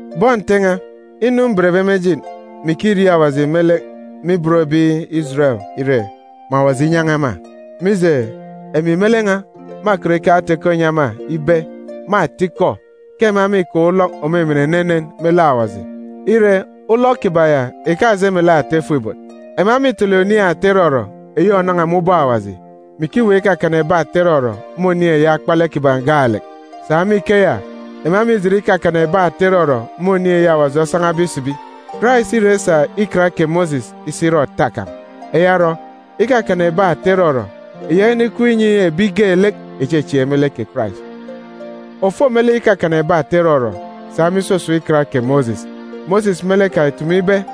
Bọn Nte n̄a, inu mbenbe me ejit, mè ikiriaak Awaji me lek me ibot ebi Ijeren ìre, mè Awaji inyan̄a ema. Mije, emi me lek n̄a mâkọt ikeke ata-ikọ inyi ema ibe, me atikọ, ke ema mîkaan̄ ulọk òmimin enenen me lek Awaji. Ire, ulọk kiban̄ ya ìkaje melek ata ifuk-ibot. Ema mîtele oniin̄ ata irọrọ eyi ònan̄a me ubọk Awaji, mè ikiweek ikakana ebi ata irọrọ me oniin̄ eyi akpalek kiban̄ gaalek. Sa me ikeya, ema mîjit ikakana ebi ata irọrọ me oniin̄ eyi Awaji osan̄abe isibi. Karais îra isa Ikan kè Mosis isi ire òta kan̄. Eya orọ, ikakana ebi ata irọrọ ìyaka inikup inyi ebi geelek ìchechieek me lek kè Karais. Òfo me lek ikakana ebi ata irọrọ sa me isusun̄ Ikan kè Mosis, Mosis me lek kan̄ ìtumu ibe,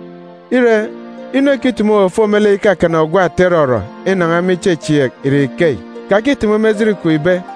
Ire, inu ekitumu òfo me lek ikakana ogwu ata irọrọ inan̄a me ichechieek ìre ikeyi, “Kakitumu me ejit kwun̄ ibe: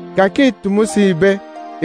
“Kakitumu si ibe: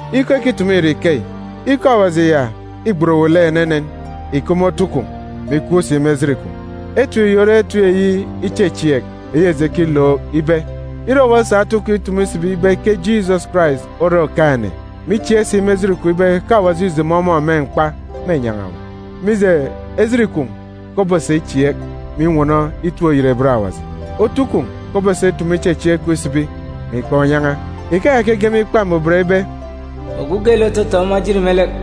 Ikọ ekitumu ìre ikeyi: “Ikọ Awaji ya îgbet owu lek enenen, ìkup me otu kwun̄, mè ikup si me ejit kwun̄.”d Etip yi ore etip eyi ichechieek eyi eji ekilook ibe: Ire owu osa otu kwun̄ itumu isibi ibe ke Jisọs Karais ore Okaan̄-ene, mè ichieek si me ejit kwun̄ ibe ke Awaji îjomo ọmọ me mkpa, mênyan̄a owu. Mije, ejit kwun̄ ke obosa ichieek, mè inwọnọ itip-oyerebet Awaji. Otu kwun̄ ke obosa itumu ichechieek kwun̄ isibi, mè ikaan̄ unyan̄a. Ikeya ke ege me Ikpa Mbuban ibe, “Ogwu geelek òtotoon̄ ọmọ ejit me lek,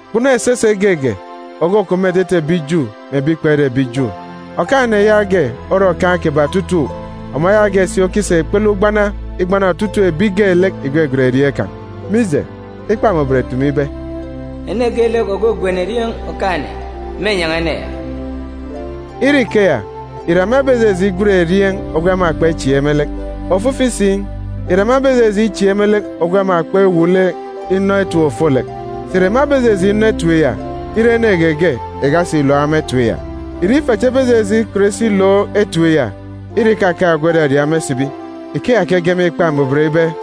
Kpunu esese geege òkukup me etete ebi Ju mè ebi kpere ebi Ju. Okaan̄-ene yaage ore Okaan̄ kiban̄ otutuuk, ọmọ yaage si okisa ikpele ugbana igbana otutuuk ebi geelek ìgwegwen erieen̄ kan̄. Mije, Ikpa Mbuban îtumu ibe, “Ene geelek ògwegwen erieen̄ Okaan̄-ene, Ire ikeya, ìre ema ebejeje igwen erieen̄ ogwu ema kpechieek me lek? Ofifi si, ìre ema ebejeje ichieek me lek ogwu ema kpewuuk lek inọ etip ofolek? Sà ìre ema ebejeje inọ etip ya, ire ene geege ìkasi ìlook ema etip ya? Ìre ife cha ebejeje ikọt isi ilook etip ya, ire ìkakaan̄ ogwu òraria ema isibi? Ikeya ke ege me Ikpa Mbuban ibe,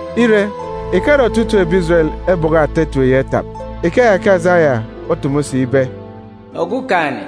Ire, ìkare otutuuk ebi Ijeren ebọkọ ata etip ya itap. Ikeya ke Asaya otumu si ibe, “Okumugwem,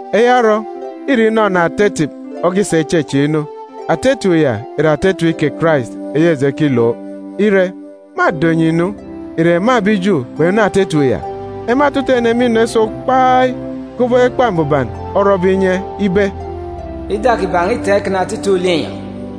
Eya orọ, îre inọnọ ata etip okisa ichechieek inu. Ata etip ya ìre ata etip kè Karais eyi eji ekilook. Ire, mâdo enyi nu, ìre ema ebi Ju kpenọ ata etip ya? Ema otutuuk ene mînọ iso kpai, kubọk Ikpa Mbuban orọbe inye ibe, “Ida kiban̄ îtaan̄ ikana otutuuk linyọn̄;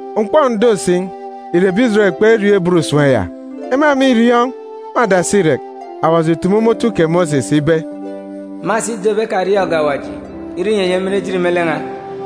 M̀kpọk ǹdo si, ìre ebi Ijeren kperiọọn̄ ibot usem ya? Ema mîriọọn̄! Me adasi irek, Awaji ìtumu me otu kè Mosis ibe, “Mâsa ido ebi ekariọọn̄ge Awaji irọ inyi enyi emin ejit me lek n̄a.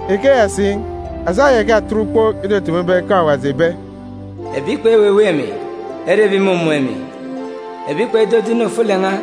Ikeya si, Asaya ìkatet ukpook itutumu ibe ke Awaji ìbe, “Ebi kpeweweek emi ere ebi ìmumun̄ emi, ebi kpedodo inu ofolek n̄a,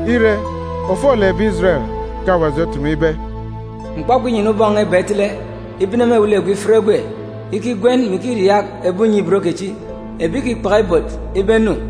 Ire, ofolek ebi Ijeren ke Awaji otumu ibe, “M̀kpọkpọ inyana ubọk iba n̄a itele, ibene me ewelegwe ifit egwe, ikigwen, mè ikiriaak ebi unye-ibot kechi, ebi ìkikpaka ibot, ibe enu.